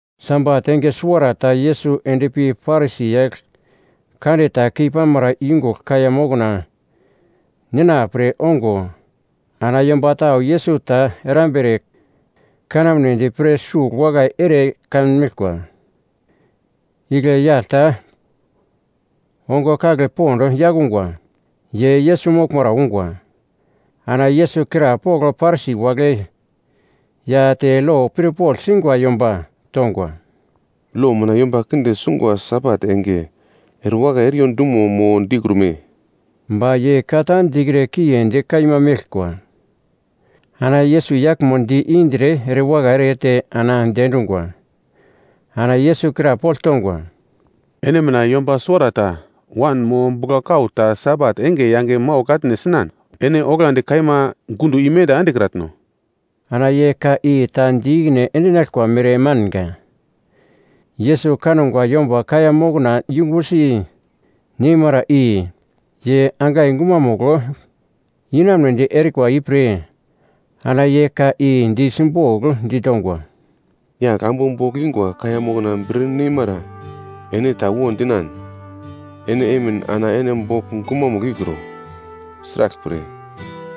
Sabat enge suwarata Yesus endpi Parisi yagl kande ta keipamara yungugl kaiya mokna nina pre ongo ana yomba tau Yesus ta erambere kanamnedi pre sugl wakai ere kanmeglkwa. Igle yagl ta ongo kagle pond yakungwa, ye Yesus moglmara ungwa. Ana Yesus krapogl Parisi wagle ya te lo pirpogl singwa yomba tongwa, “Lo mina yomba kinde sungwa Sabat enge, erewakai eriyo dumo mo dikrume?” Ba ye ka ta dikre kiendi kaima meglkwa. Ana Yesus yaglmo di-indre erewakai erete ana diendungwa. Ana Yesus krapogl tongwa, “Ene mina yomba suwarata wan mo buglan kau ta Sabat enge yange maugl atne sinan, ene oglandi kaima gundo i menda endekratno?” Ana ye ka i ta di ikine endinaglkwa mere manga. Yesus kangwa yomba kaiya mokna yumbusi neimara i, ye angai gumamugl inamunedi erikwa ipre ana ye ka i di simbogl ditongwa, “Yagl ambu bogl ingwa kaiya mokna bir neimara ene ta wo dinan, ene emin ana ene bogl gumamugl ikro, sraglpre,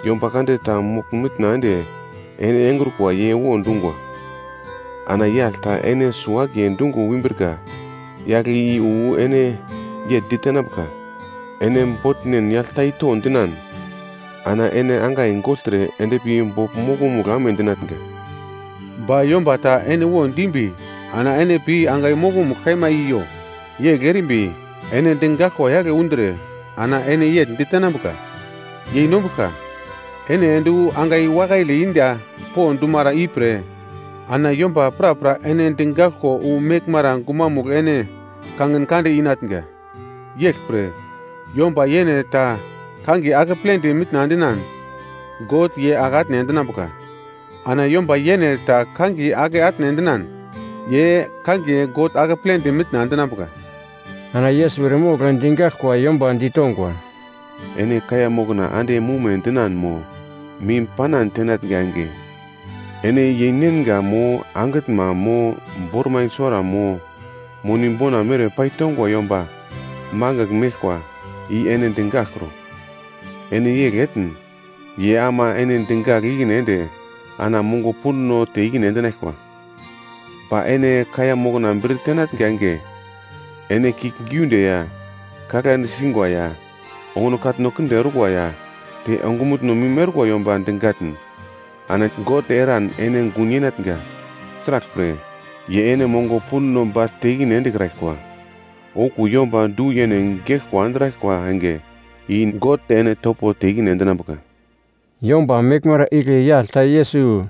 yomba kande ta mogl-mitna ende ene engrukwa ye wo dungwa. Ana yagl ta ene suwo-akiye dungo umbrika yagle i wu ene yegl ditenambuka, ‘Ene botnen yagl ta i to’ dinan. Ana ene angai gogltre endpi bogl mokonomugl amedinatnga. Ba yomba ta ene wo dimbi ana ene pi angai mokomugl kaima i yo, yegl erimbi ene digaglkwa yagl undre ana ene yegl ditenambuka, ‘Yeinombuglka, ene ende wu angai wakaile inda po dumara ipre.’ Ana yomba prapra ene digaglko wu meglmara gumanomugl ene kangin kande inatnga. Yeglpre, yomba yene ta kangiye akepledi mitna endinan God ye ake atne endinambuka ana yomba yene ta kangiye ake atne endinan, ye kangiye God akepledi mitna endinambuka.” Ana Yesus eremogl digaglkwa yomba ditongwa, “Ene kaiya mokna ande mume dinan mo mim panan tenatnga enge, ene yeinenga mo angitnma mo bormai suwara mo moni bona mere paitongwa yomba mangigl meglkwa i ene digaglkro. Ene yegl etn, ye ama ene digagl ikine ende ana mongo pundo te ikine endinaglkwa. Ba ene kaiya mokna bir tenatnga enge, ene kiuglgiunde ya, kaglande singwa ya, onguno katno kinde orkwa ya te ongumutno mim orkwa yomba digatn, ana God eran ene gun yenatnga, sraglpre ye ene mongo pundo bagl te ikine endekraglkwa. Okuwo yomba du-yene geglkwa andraglkwa enge i God ene topo te ikine endinambuka.” Yomba meglmara igle yagl ta Yesus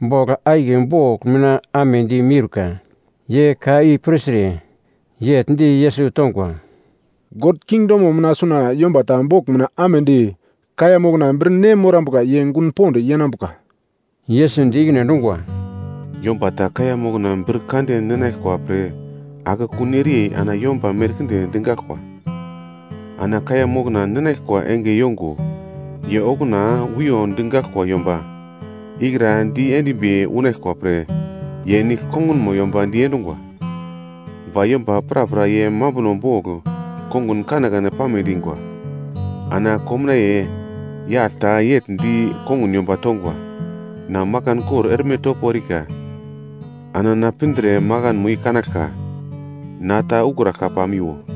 bogl akiye bogl mina amedi miurka. Ye ka i pirtre, yegl di Yesus tongwa, “God kingdomo mina suna yomba ta bogl mina amedi kaiya mokna bir ne morambuka ye gun pond yenambuka.” Yesus di ikine endungwa, “Yomba ta kaiya mokna bir kande ninaglkwa pre akekun ereyei ana yomba merkinde digaglkwa. Ana kaiya mokna ninaglkwa enge yongo ye okuna wiyo digaglkwa yomba ikra di endimbi unaglkwa pre ye nigl kongunmo yomba diedungwa. “Ba yomba prapra ye mambuno bogl konguno kanekane pame dingwa. Ana komnaiye yagl ta yegl di kongun yomba tongwa, ‘Na makan kor erme topo erika, ana na pindre makanmo i kanaglka. Na ta ukraglka pamiwo.’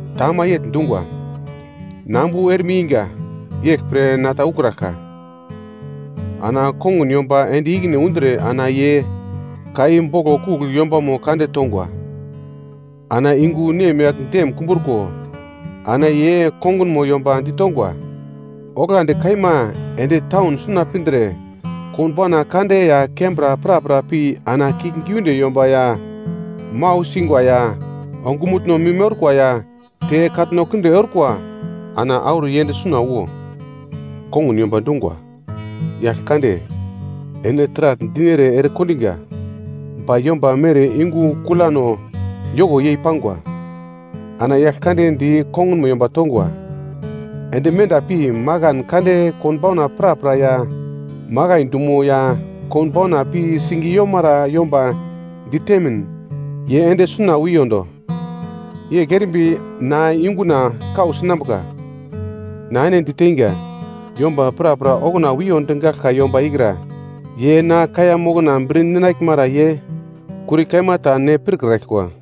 “Ta ama yegl dungwa, ‘Na ambu erme inga, yeglpre na ta ukraglka.’ “Ana kongun yomba ende ikine undre ana ye ka i boglo kugl yombamo kande tongwa. Ana yungu nemyagl dem kumbruko ana ye kongunmo yomba ditongwa, ‘Oglandi kaima ende taun suna pindre konbauna kande ya kembra prapra pi ana kiuglgiunde yomba ya mau singwa ya ongumutno mim orkwa ya te katno kinde orkwa ana auro yend suna wo.’ “Kongun yomba dungwa, ‘Yagl kande, ene taragl dinere ere kondiga ba yomba mere yungu kulano yoko yei pangwa.’ “Ana yagl kande di kongunmo yomba tongwa, ‘Ende menda pi makan kande konbauna prapra ya makai dumo ya konbauna pi sing yomara yomba ditemin, ye ende suna wiyondo. Yegl erimbi na yunguna kau sinambuka. Na ene diteinga, yomba prapra okuna wiyo digaglka yomba ikra ye na kaiya mokna bir ninaglmara ye kuri kaima ta ne pirkraglkwa.’”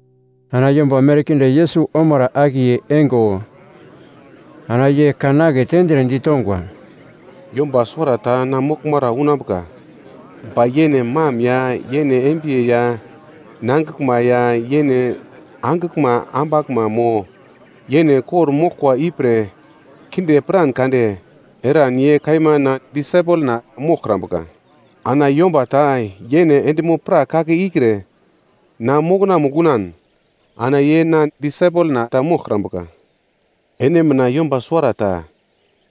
Ana yomba merkinde Yesus omara akiye eingo, ana ye kan aketendre ditongwa, “Yomba suwarata na moglmara unambuka, ba yene mam ya yene embiye ya nangiglma ya yene angiglma ambaglma mo yene kor-moglkwa ipre kinde piran kade eran ye kaima na disaipelna moglkrambuka. Ana yomba ta yene endimo-prak kake ikre, na mokonamugl unan, ana ye na disaipelna ta moglkrambuka. “Ene mina yomba suwarata,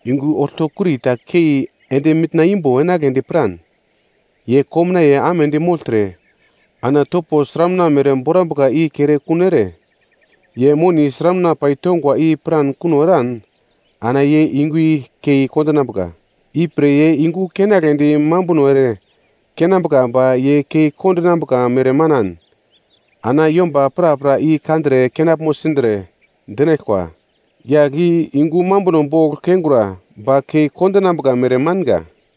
yungu oltokuri ta kei ende mitna imbo enagledi piran, ye komnaiye amedi mogltre ana topo sramuna mere borambuka i kere kuno ere, ye moni sramuna pai tongwa i piran kuno eran ana ye yungu i kei kondinambuka. Ipre ye yungu keinagledi mambuno ere keinambuka ba ye kei kondinambuka mere manan, ana yomba prapra i kandre kenaglmo sindre, dinaglkwa, ‘Yagl i yungu mambuno bogl keingura, ba kei kondinambuka mere manga.’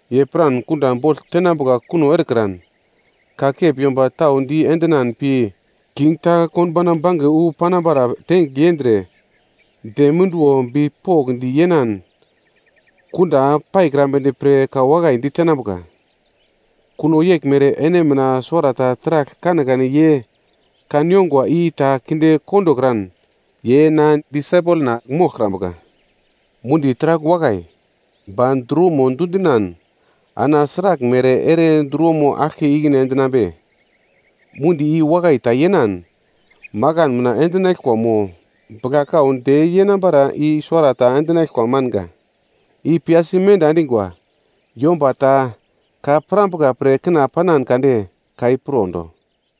Ye piran kunda bogl tenambuka kuno erekran, kakep yomba tau di endinan pi king ta konbauna bange wu panambara tengigl yendre dem munduwo bipokndi yenan kunda paikrambedi pre ka wakai ditenambuka. Kuno yeglmere ene mina suwarata taragl kanekane ye kan ongwa i ta kinde kondokran, ye na disaipelna moglkrambuka. “Mundi taragl wakai, ba druwomo dundinan ana sraglmere ere druwomo aglke ikine endinambe? Mundi i wakai ta yenan makan mina endinaglkwa mo bugla-kau de yenambara i suwarata endinaglkwa manga. I piyasi menda endingwa. “Yomba ta ka pirambuka pre kina panan kade, ka i pirondo!”